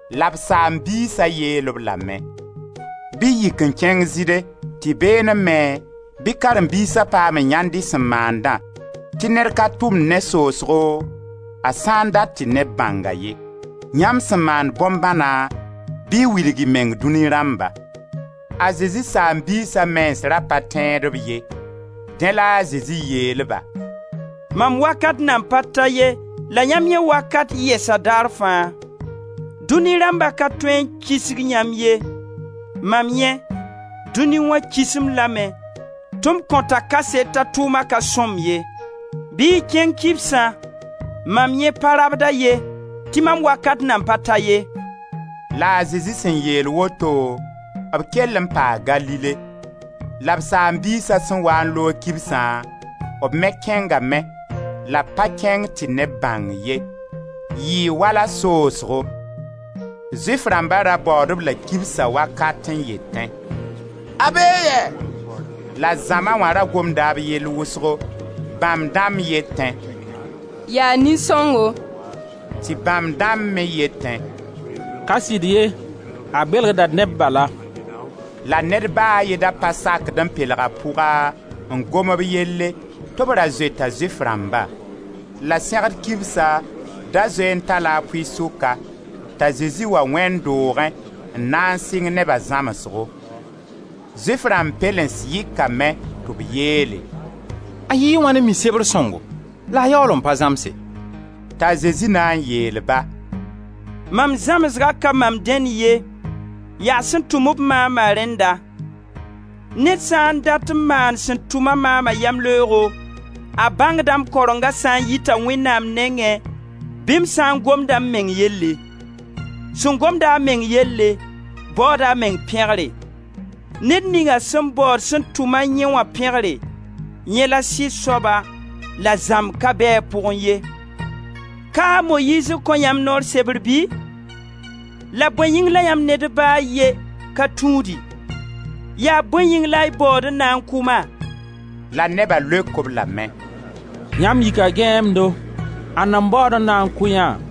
La b saam-biisa yeel-b lame: «Bɩ y yik n kẽng Zɩɩde tɩ beelẽ me bɩ karen-biisa paam n yãend y sẽn maandã, tɩ ned ka tʋmd ne soosgo, a sã dat tɩ neb bãng-a ye. Yãmb sẽn maand bõn-bãna, bɩ y wilg y meng dũni rãmba.» A Zezi saam-biisa mens ra pa tẽed-b ye. Dẽ la a Zezi yeel-ba: «Mam wakat nan pa ta ye la yãmb yẽ wakat yɛsa daar fãa. Dũni rãmba ka tõe n kisg yãmb ye; maam yẽ, dũni wã kis-m lame tɩ m kõta kaset t'a tʋʋma ka sõmb ye. Bɩ y kẽng kibsã, mam yẽ pa rabd-a ye, tɩ mam wakat nan pa ta ye.» La a Zezi sẽn yeel woto, b kell n paa Galile. La b saam-biisa sẽn waa n loog kibsã, b me kẽngame, la b pa kẽng tɩ neb bãng ye, yɩɩ wala soosgo. Zʋɩf rãmba ra baood-b la kibsa wakat n yetẽ: «A bee yɛ?» La zãma wã ra gomda b yell wʋsgo. Bãmb dãmb yetẽ: «Yaa nin-sõngo.» Tɩ bãmb dãmb me yetẽ: «Ka sɩd ye, a belgda neb bala.» La ned ba a ye da pa sakd n pelg a pʋga n gomb b yelle, tɩ b ra zoeta Zʋɩf rãmba. La Sẽgd kibsa da zoe n ta-la a pʋɩ-sʋka t'a Zezi wa wẽnd doogẽ n na n sɩng neba zãmsgo. Zʋɩf rãmb pɛlens yɩkame tɩ b yeele: «A yɩɩ wãn n mi Sebr sõngo la a yaool n pa zãmse?» T'a Zezi na n yeel-ba: «Mam zãmsgã ka mam dẽnd ye, yaa sẽn tʋm-b maama rẽnda. Ned sã n dat n maan sẽn tʋma maama yamleoogo, a bãngda m karenga sã n yita Wẽnnaam nengẽ bɩ m sã n gomda m meng yelle. Sẽn gomd-a a meng yelle, baooda a meng pẽgre; Ned ninga sẽn baood sẽn tʋma yẽ wã pẽgre, yẽ la sɩd soaba la zãmb ka bɛ a pʋgẽ ye. Ka a Moyiiz n kõ yãmb noor sebr bɩ? La bõe yĩng la yãmb ned ba a ye ka tũudi? Yaa bõe yĩng la y baood n na n kʋ-ma?» La neba leok-b lame: «Yãmb yika gãeemdo, ãnna n baood n na n kʋ yã?»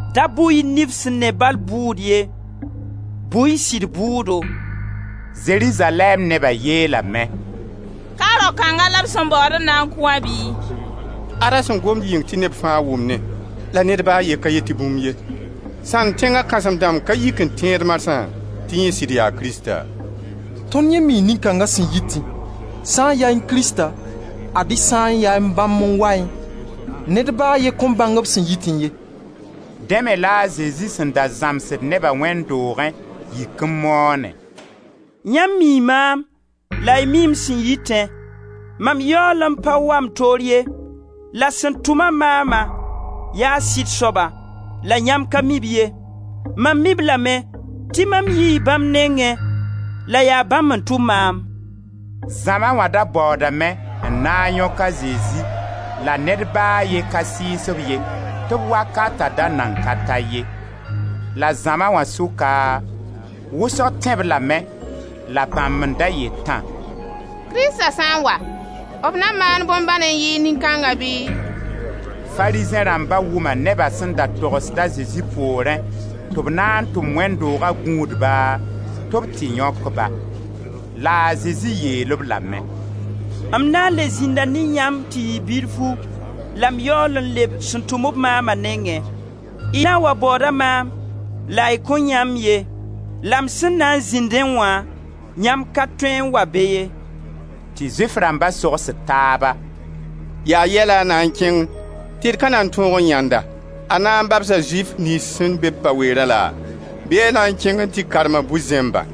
Da bʋ-y nif sẽn ne bal bʋʋd ye, bʋ-y sɩd bʋʋdo.» Zerizalɛɛm neba yeelame: «Ka rao kãnga la b sẽn baood n na n kʋ wã bɩ? Ad-a sẽn gomd yɩng tɩ neb fãa wʋmnẽ, la ned ba a ye ka yet tɩ bũmbu ye. Sãnd tẽnga kãsem-dãmb ka yik n tẽed marsã tɩ yẽ sɩd yaa Krista? Tõnd yẽ mii nin-kãnga sẽn yitẽ. Sã n yaẽ Krista, ad-y sã n yaa bãmb n waẽ, ned ba a ye kõn bãng b sẽn yitẽ ye.» Dẽ me la a Zezi sẽn da zãmbsd neba wẽnd doogẽ yik n moone: «Yãmb mii maam, la y mii m sẽn yitẽ; mam yaool pa wa m toor ye, la sẽn tʋma maama yaa sɩd soaba, la yãmb ka mi-b ye. Mam mii-b lame tɩ mam yii bãmb nengẽ, la yaa bãmb n tʋm maam.» Zãma wã da baoodame n na n yõk a Zezi la ned ba a ye ka sɩɩs-b ye tɩ b wakata da nan ka ta ye. La zãma wã sʋka, wʋsg tẽ-b lame la bãmb n da yetã: «Krista sã n wa b na maan bõn-bãn n yɩɩg nin kãnga bɩ?» Farizẽ rãmba wʋma neba sẽn da togsd a Zezi poorẽ tɩ b na n tʋm wẽnd dooga gũudba tɩ b tɩ yõk-ba. La a Zezi yeel-b lame: «M na n le zĩnda ne yãmb tɩ yɩ bilfu, la m yaool n leb sẽn tʋm-b maama nengẽ. Y na n wa baooda maam la y kõn yãe-m ye; la m sẽn na n zĩndẽ wã, yãmb ka tõe n wa be ye.» Tɩ Zʋɩf rãmba sogsd taaba: «Yaa yɛ la a na n kẽng tɩ d ka na tõog n yãend-a? A na n babsa Zʋɩf niyns sẽn be-b pa-weera laa? Bɩ a na n kẽng n tɩ karma bu-zẽmbã?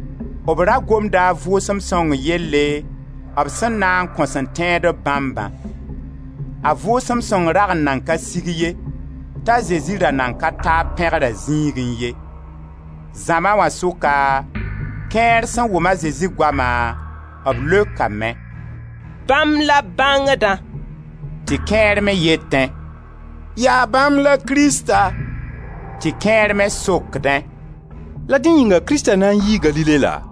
B ra gomda a Vʋʋsem Sõng yelle b sẽn na n kõ sẽn tẽ-b bãmbã. A Vʋʋsem Sõng rag n nan ka sig ye, t'a Zezi ra nan ka ta b pẽgra zĩigẽ ye. Zãma wã sʋka, kẽer sẽn wʋm a Zezi goama, b leokame: «Bãmb la bãngdã.» Tɩ kẽer me yeetẽ: «Yaa bãmb la Krista.» Tɩ kẽer me sokdẽ: «La dẽ yĩnga Krista na n yii Galile la?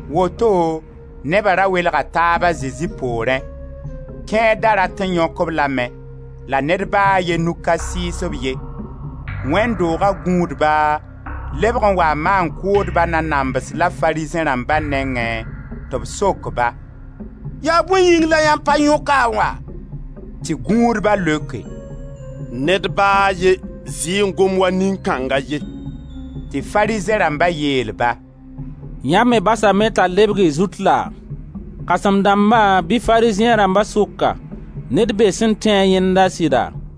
Woto neba ra welga taab a Zezi poorẽ. Kẽer da rat n yõk-b lame, la ned ba a ye nug ka sɩɩs-b ye. Wẽnd dooga gũudba lebg n waa maan-kʋʋdba nanams la Farizẽ rãmba nengẽ tɩ b sok-ba: «Yaa bõe yĩng la yãmb pa yõk-a n wa?» Tɩ gũudba leoke: «Ned ba a ye zɩ n gom wa nin-kãnga ye.» Tɩ Farizẽ rãmba yeel-ba: «Yãmb me basame t'a lebg y zut laa? Kãsem-dãmba bɩ Farizẽ rãmba sʋka ned bee sẽn tẽ-a yẽnda sɩda?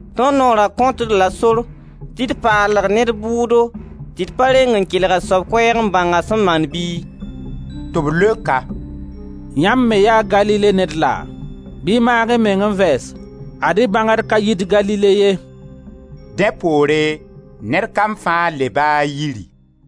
«Tõnd noora kõt-d la sor tɩ d paalg ned bʋʋdo tɩ d pa reng n kelg a soab koɛɛg n bãng a sẽn maan bɩ?» Tɩ b leok-a: «Yãmb me yaa Galile ned laa? Bɩ y maag-y meng n vɛɛse, ad-y bãngd ka yit Galile ye.» [ Dẽ poore ned kam fãa leba a yiri.